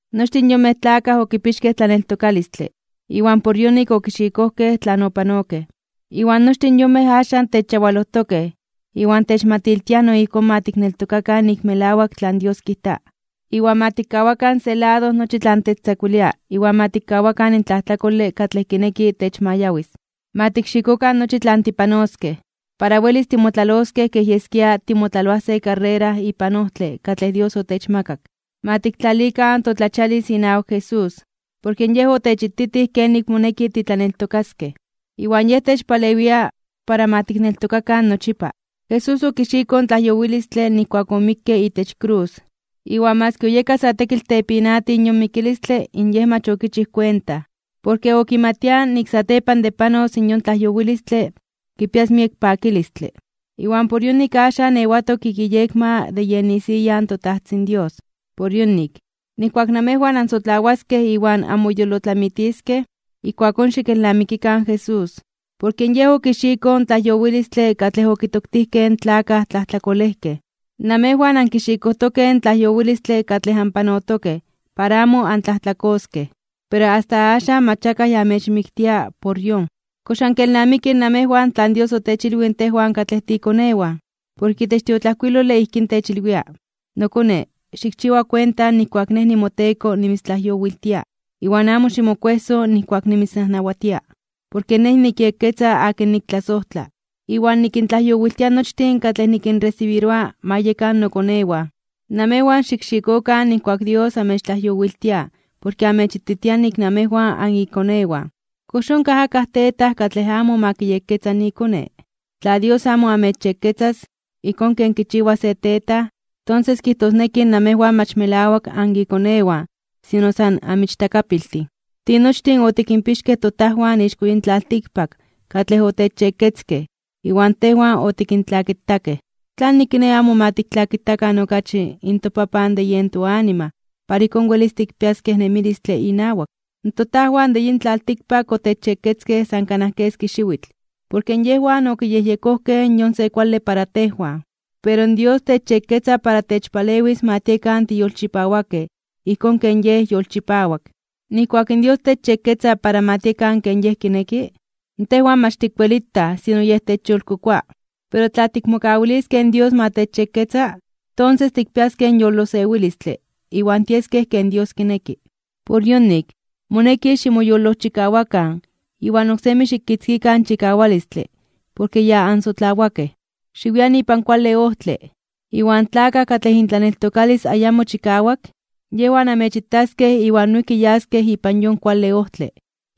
Nochtin yonmej tlakaj okipixkej tlaneltokalistle iwan por yonik okixikojkej tlan opanokej. Iwan nochtin yonmej axan techyawalojtokej iwan techmatiltiaj no ijkón ma tikneltokakan nik melawak tlan Dios kijta. Iwan ma tikkawakan se lado nochi tlan techtzakuilia iwan ma tikkawakan in tlajtlakole katlej kineki techmayawis. Ma tikxikokan nochi tlan tipanoskej, para welis timotlaloskej kej yeskia timotlaloaj se karrera ipan ojtle katlej Dios otechmakak. Ma tiktlalikan totlachialis inawak Jesús. Porke Yej otechititij kenik moneki titlaneltokaskej, iwan Yej techpalewia para ma tikneltokakan nochipa. Jesús okixikoj in tlajyowilistle nijkuak omikke itech krus, iwan maski oyeka sa tekitl tepinatij yon mikilistle in Yej mach okichij kuenta. Porke okimatia nik satepan de panos yon tlajyowilistle kipias miek pakilistle. Iwan por yonik axan ewatok ik iyekma de yen isiya in toTajtzin Dios. Por yonik, nijkuak namejwan anmosotlawaskej iwan anmoyolotlamitiskej, ijkuakón xikelnamikikan in Jesús. Porke Yej okixikoj in tlajyowilistle katlej okitoktijkej in tlakaj tlajtlakolejkej. Namejwan ankixikojtokej in tlajyowilistle katlej anpanotokej para amo antlajtlakoskej, pero asta axan mach akaj ya amechmiktia por yon. ¿Kox ankelnamikij namejwan tlan Dios otechilwij tejwan katlej tiikonewan? Porke itech tiotlajkuilole ijkín techilwia: Nokone, xikchiwa kuenta nijkuak Nej nimoTeko nimitztlajyowiltia, iwan amo ximokuejso nijkuak nimitznajnawatia. Porke Nej nikyekketza akin niktlasojtla, iwan nikintlajyowiltia nochtin katlej nikinresibiroa ma yekan nokonewan. Namejwan xikxikokan nijkuak Dios amechtlajyowiltia porke amechititia nik namejwan anikonewan. ¿Kox onkaj akaj tetaj katlej amo ma kiyekketza ikone? Tla Dios amo amechyekketzas, ijkón ken kichiwa se tetaj, tonses kijtosneki namejwan mach melawak anikonewan sino san anmichtakapiltin. Tinochtin otikinpixkej totajwan ixko yin tlaltikpak katlej otechyekketzkej iwan tejwan otikintlakitakej. ¿Tlanik kiné amo ma tiktlakitakan okachi in toPapan de yen toanima para ijkón welis tikpiaskej nemilistle inawak? Totajwan de yin tlaltikpak otechyekketzkej san kanaj keski xiwitl, porke yejwan okiyejyekojkej yon se kuale para tejwan. Pero Dios techyekketza para techpalewis ma tiekan tiyolchipawakej ijkón ken Yej yolchipawak. Nijkuak in Dios techyekketza para ma tiekan ken Yej kineki, tejwan mach tikwelitaj sino yej techyolkokoa. Pero tla tikmokawiliskej in Dios ma techyekketza, tonses tikpiaskej yolosewilistle iwan tieskej ken Dios kineki. Por yonik, moneki ximoyolojchikawakan iwan oksemi xikitzkikan chikawalistle porke ya ansotlawakej. Xiwian ipan kuale ojtle, iwan tlakaj katlej intlaneltokalis ayamo chikawak, yejwan amechitaskej iwan noijki yaskej ipan yon kuale ojtle.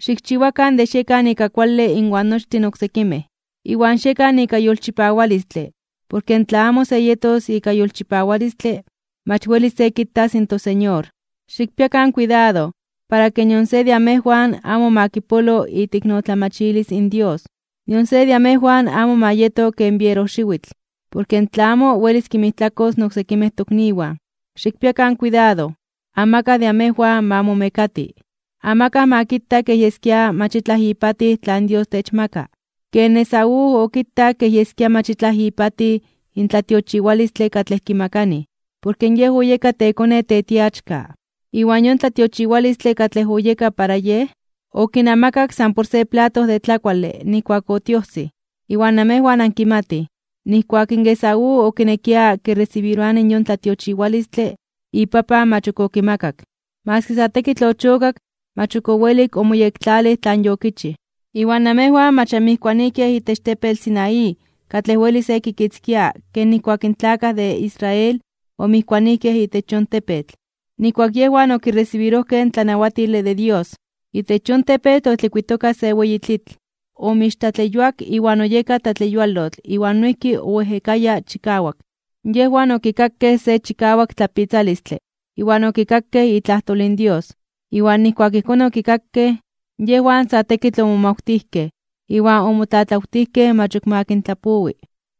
Xikchiwakan de xiekan ika kuale inwan nochtin oksekimej. Iwan xiekan ika yolchipawalistle porke tla amo se yetos ika yolchipawalistle, mach welis se kitas in toSeñor. Xikpiakan kuidado para ke nion se de amejwan amo ma kipolo iteiknotlamachilis in Dios. Nion se de amejwan amo ma yeto ken bierojxiwitl, porke in tlamo welis kinmijtlakos in oksekimej tokniwan. Xikpiakan kuidado, amakaj de amejwan ma momekati. Amakaj ma kita kej yeskia mach itlaj ipatij tlan Dios techmaka, ken Esaú okitak kej yeskia mach itlaj ipatij in tlatiochiwalistle katlej kimakanij, porke yej oyeka tekone tetiachka. Iwan yon tlatiochiwalistle katlej oyeka para yej, okinamakak san por se plato de tlakuale nijkuak otiojsij. Iwan namejwan ankimatij, nijkuak Esaú okinekia kiresibiroani yon tlatiochiwalistle, ipapan mach ok okimakak. Maski sa tekitl ochokak, mach ok owelik omoyektlalij tlan yokichij. Iwan namejwan mach anmijkuanijkej itech tepetl Sinaí katlej weli se kikitzkia ken nijkuak in tlakaj de Israel omijkuanijkej itech yon tepetl, nijkuak yejwan okiresibirojkej in tlanawatile de Dios. Itech yon tepetl otlikuitoka se weyi tlitl, omixtlatleyuak iwan oyeka tlatleyualotl iwan noijki oejekaya chikawak. Yejwan okikakej se chikawak tlapitzalistle iwan okikakej itlajtol in Dios. Iwan nijkuak ijkón okikakej, yejwan sa tekitl omomawtijkej iwan omotlatlawtijkej mach ok ma kintlapowi.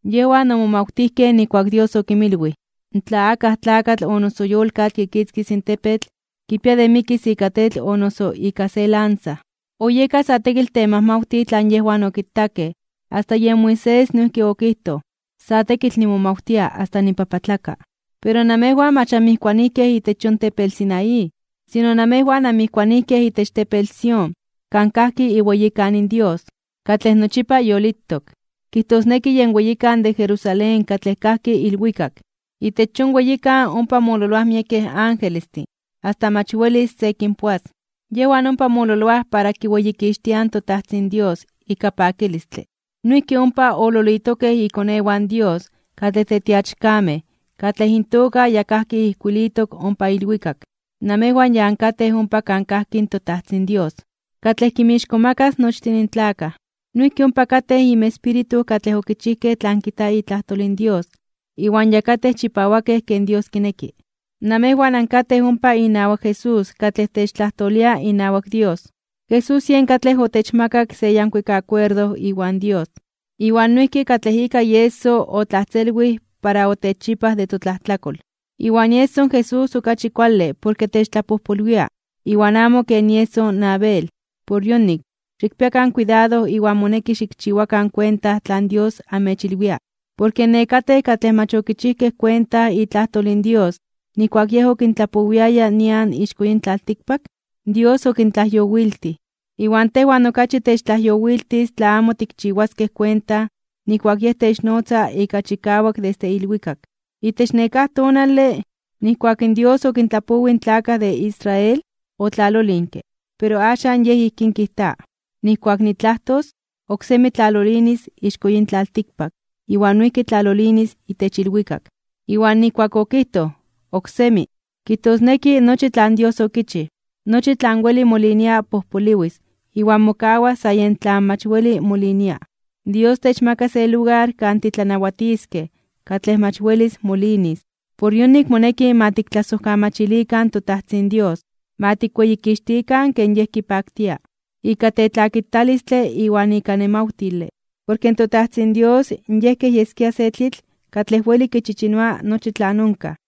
Yejwan omomawtijkej nijkuak Dios okinmilwij: “Tla akaj tlakatl o noso yolkatl kitzkis in tepetl, kipia de mikis ika tetl o noso ika se lanza.” Oyeka sa tekitl temajmawtij tlan yejwan okitakej asta yen Moisés noijki okijtoj: “Sa tekitl nimomawtia asta nipapatlaka (nibibioka).” Pero namejwan mach anmijkuanijkej itech yon tepetl Sinaí, sino namejwan anmijkuanijkej itech tepetl Sión kan kajki iweyikan Dios, katlej nochipa yolitok. Kijtosneki yen weyikan de Jerusalén katlej kajki ilwikak. Itech yon weyikan ompa mololoaj miekej angelestin asta mach welis se kinpoas, yejwan ompa mololoaj para kiweyikixtiaj in toTajtzin Dios ika pakilistle. Noijki ompa ololitokej ikonewan Dios katlej tetiachkamej katlej intoka ya kajki ijkuilitok ompa ilwikak. Namejwan ya ankatej ompa kan kajki in toTajtzin Dios, katlej kinmixkomakas (kintzonmanas) nochtin tlakaj. Noijki ompa katej inmespíritu katlej okichijkej tlan kijta itlajtol in Dios iwan ya katej chipawakej ken Dios kineki. Namejwan ankatej ompa inawak Jesús katlej techtlajtolia inawak Dios. Jesús yen katlej otechmakak se yankuik akuerdo iwan Dios, iwan noijki katlej ika ieso otlajtzelwij para otechchipaj de totlajtlakol. Iwan ieso in Jesús okachi kuale porke techtlapojpolwia iwan amo ken ieso in Abel. Por yonik, xikpiakan kuidado iwan moneki xikchiwakan kuenta tlan Dios amechilwia. Porke nekatej katlej mach okichijkej kuenta itlajtol in Dios nijkuak Yej okintlapowiaya nian ixko yin tlaltikpak, in Dios okintlajyowiltij. Iwan tejwan okachi techtlajyowiltis tla amo tikchiwaskej kuenta nijkuak Yej technotza ika chikawak desde ilwikak. Itech nekáj tonale, nijkuak Dios okintlapowij in tlakaj de Israel, otlalolinke. Pero axan Yej ijkín kijta: “Nijkuak nitlajtos, oksemi tlalolinis ixko yin tlaltikpak iwan noijki tlalolinis itech ilwikak.” Iwan nijkuak okijtoj “oksemi”, kijtosneki nochi tlan Dios okichij, nochi tlan weli molinia pojpoliwis iwan mokawas sa yen tlan mach weli molinia. Dios techmaka se lugar kan titlanawatiskej katlej mach welis molinis. Por yonik moneki ma tiktlasojkamachilikan toTajtzin Dios, ma tikweyikixtikan ken Yej kipaktia, ika tetlakitalistle iwan ika nemawtile. Porke in toTajtzin Dios Yej kej yeskia se tlitl katlej weli kichichinoa nochi tlan onkaj.